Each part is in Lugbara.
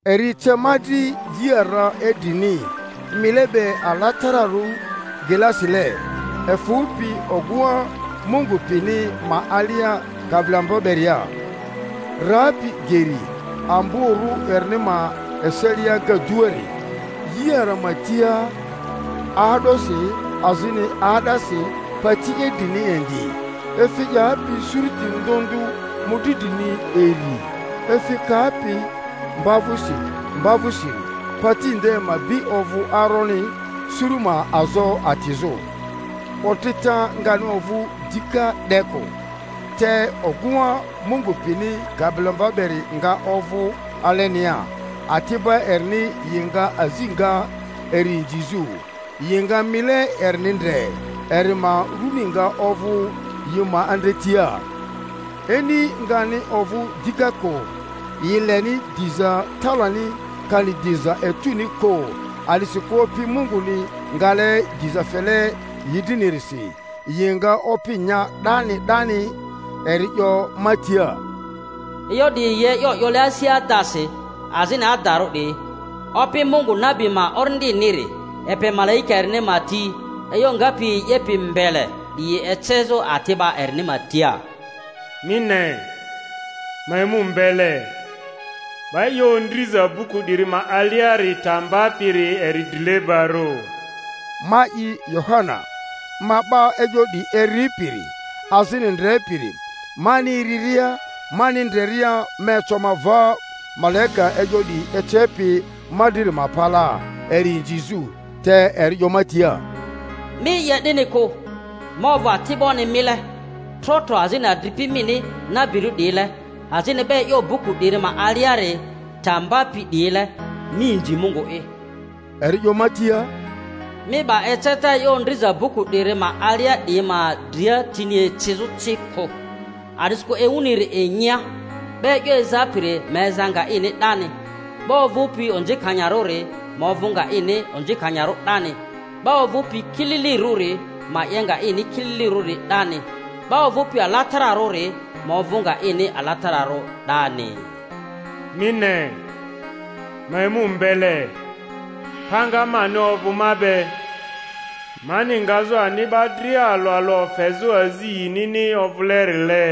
Eri ece ma dri yi ara idrini, mile be alatararᴜ glasile, efᴜpi ogᴜŋa Mungu pini ma alia Kabilomva beria, rapi geri amborᴜ erini ma eselia agaduari; yi ara ma tia 'aa'dosi azini 'aa'dasi pati idrini indi, efi 'yapi suruti ndᴜ ndᴜ mᴜdri drini iri, efi kapi mba vᴜsi mba vᴜsiri; pati nde ma bi ovᴜ aroni suru ma azo atizᴜ. Otrita ngani ovᴜ dika 'de kᴜ, te ogᴜŋa Mungu pini Kabilomva beri nga ovᴜ alenia; ati'ba erini yi nga azi nga eri inzizᴜ, yi nga mile erini ndre, eri ma runi nga ovᴜ yi ma andretia. Ini ngani ovᴜ dika kᴜ; yi leni diza talani kani diza etᴜni kᴜ, a'disikᴜ Opi Munguni ngale diza fele yi drinirisi; yi nga opi nya 'dani 'dani. Eri 'yo ma tia, E'yo 'diyi yi e'yo 'yole asi adasi, azini adarᴜ 'diyi. Opi, Mungu nabi ma orindiniri, epe malaika erini ma ti e'yo ngapi yi 'yepi mbele 'diyI ecezᴜ ati'ba erini ma tia. Mi ne, ma emu mbele. 'Ba e'yo ondriza buku 'diri ma aliari ta mbapiri eri drilebarᴜ. Ma'i, Yohana, ma 'ba e'yo 'diyi eripiri azini ndrepiri. Mani eriria, mani ndreria, ma eco ma va malaika e'yo 'diyi ecepi ma driri ma palaa eri inzizᴜ; te eri 'yo ma tia, Mi 'ye 'dini kᴜ! Ma ovᴜ ati'boni mile trotro azini adripi mini nabirᴜ 'diyile, azini 'ba e'yo buku 'diri ma aliari ta mbapI 'diyile. Mi inzi Mungu'i. Eri 'yo ma tia, Mi 'ba eceta e'yo ondriza buku 'diri ma alia 'diyi ma dria tini ecizᴜ ci kᴜ, a'disikᴜ ewuniri inyia. 'Ba e'yo ezapiri ma eza nga ini 'dani, 'ba ovᴜpi onzikanyarᴜri ma ovᴜ nga ini onzikanyarᴜ 'dani, 'ba ovᴜpi kililirᴜri ma 'ye nga ini kililirᴜ 'dani, 'ba ovᴜpi alatararᴜri ma ovᴜ nga ini alatararᴜ 'dani. Mi ne, ma emu mbele, panga mani ovᴜ ma be, mani ngazᴜ ani 'ba dria alᴜ alᴜ ofezᴜ azi yinini ovᴜlerile.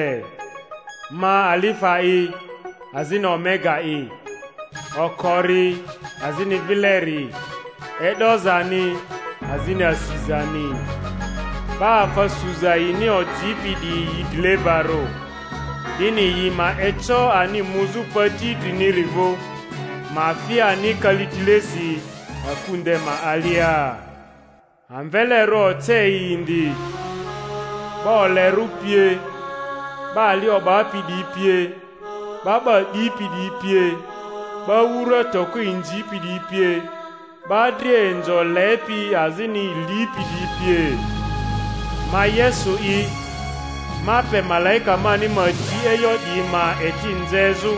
Ma Alifa'i azini Omega'i, okori azini vileri, e'dozani azini asizani. 'Ba afa suza yini ojipi 'diyi yi drilebarᴜ, 'dini yi ma eco ani muzᴜ pati idriniri vᴜ, ma fi ani kalitilesi aku nde ma alia. Amvelerᴜ oce yi indi, 'ba olerᴜ pie, 'ba ali o'bapi 'diyi pie, 'ba 'ba 'dipi 'diyi pie, 'ba wura toko inzipi 'diyi pie, 'ba dria inzo lepi azini lipi 'diyi pie. Ma Yesu'i, ma pe malaika mani ma ti e'yo 'diyi ma eti nzezᴜ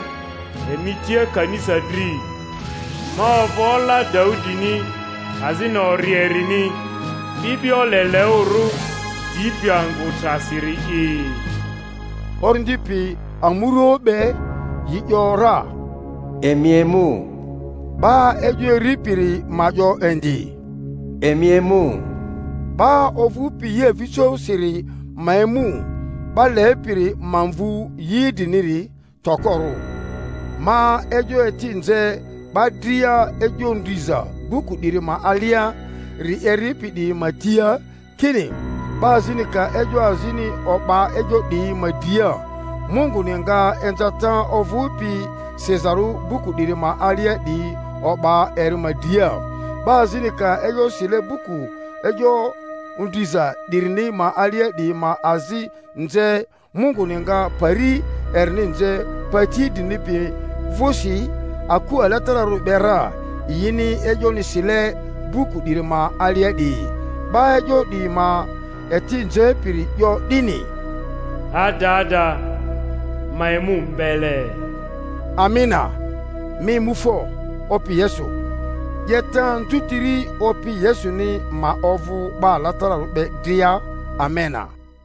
emi tia kanisa dri. Ma ovᴜ ola Daudini azini ori erini, 'bi'bio leleᴜrᴜ dipi angᴜ trasiri'i. Orindi pi amurᴜoᴜ be yi ‘yora, Emi emu. 'Ba e'yo eripiri ma 'yo indi, Emi emu. 'Ba ovᴜpi yi avijosiri ma emu; 'ba lepiri ma mvu yi idriniri tokorᴜ. Ma e'yo eti nze 'ba dria e'yo ondriza buku 'diri ma aliari eripi 'diyi ma tia, kini: 'Ba azini ka e'yo azini o'ba e'yo 'diyi ma dria, Munguni nga inzata ovᴜpi sizarᴜ buku 'diri ma alia 'diyi o'ba eri ma dria; 'ba azini ka e'yo sile buku e'yo ondriza 'dirini ma alia 'diyi ma azi nze, Munguni nga pari erinI nze pati idrini pi vᴜsi aku alatararᴜri be ra, yini e'yoni sile buku 'diri ma alia'diyi. 'Ba e'yo 'diyi ma eti nzepiri 'yo 'dini, Adada, ma emu mbele. Amena. Mi emu fo, Opi Yesu! 'Yeta anzutiri Opi Yesuni ma ovᴜ 'ba alatararᴜ be dria. Amena.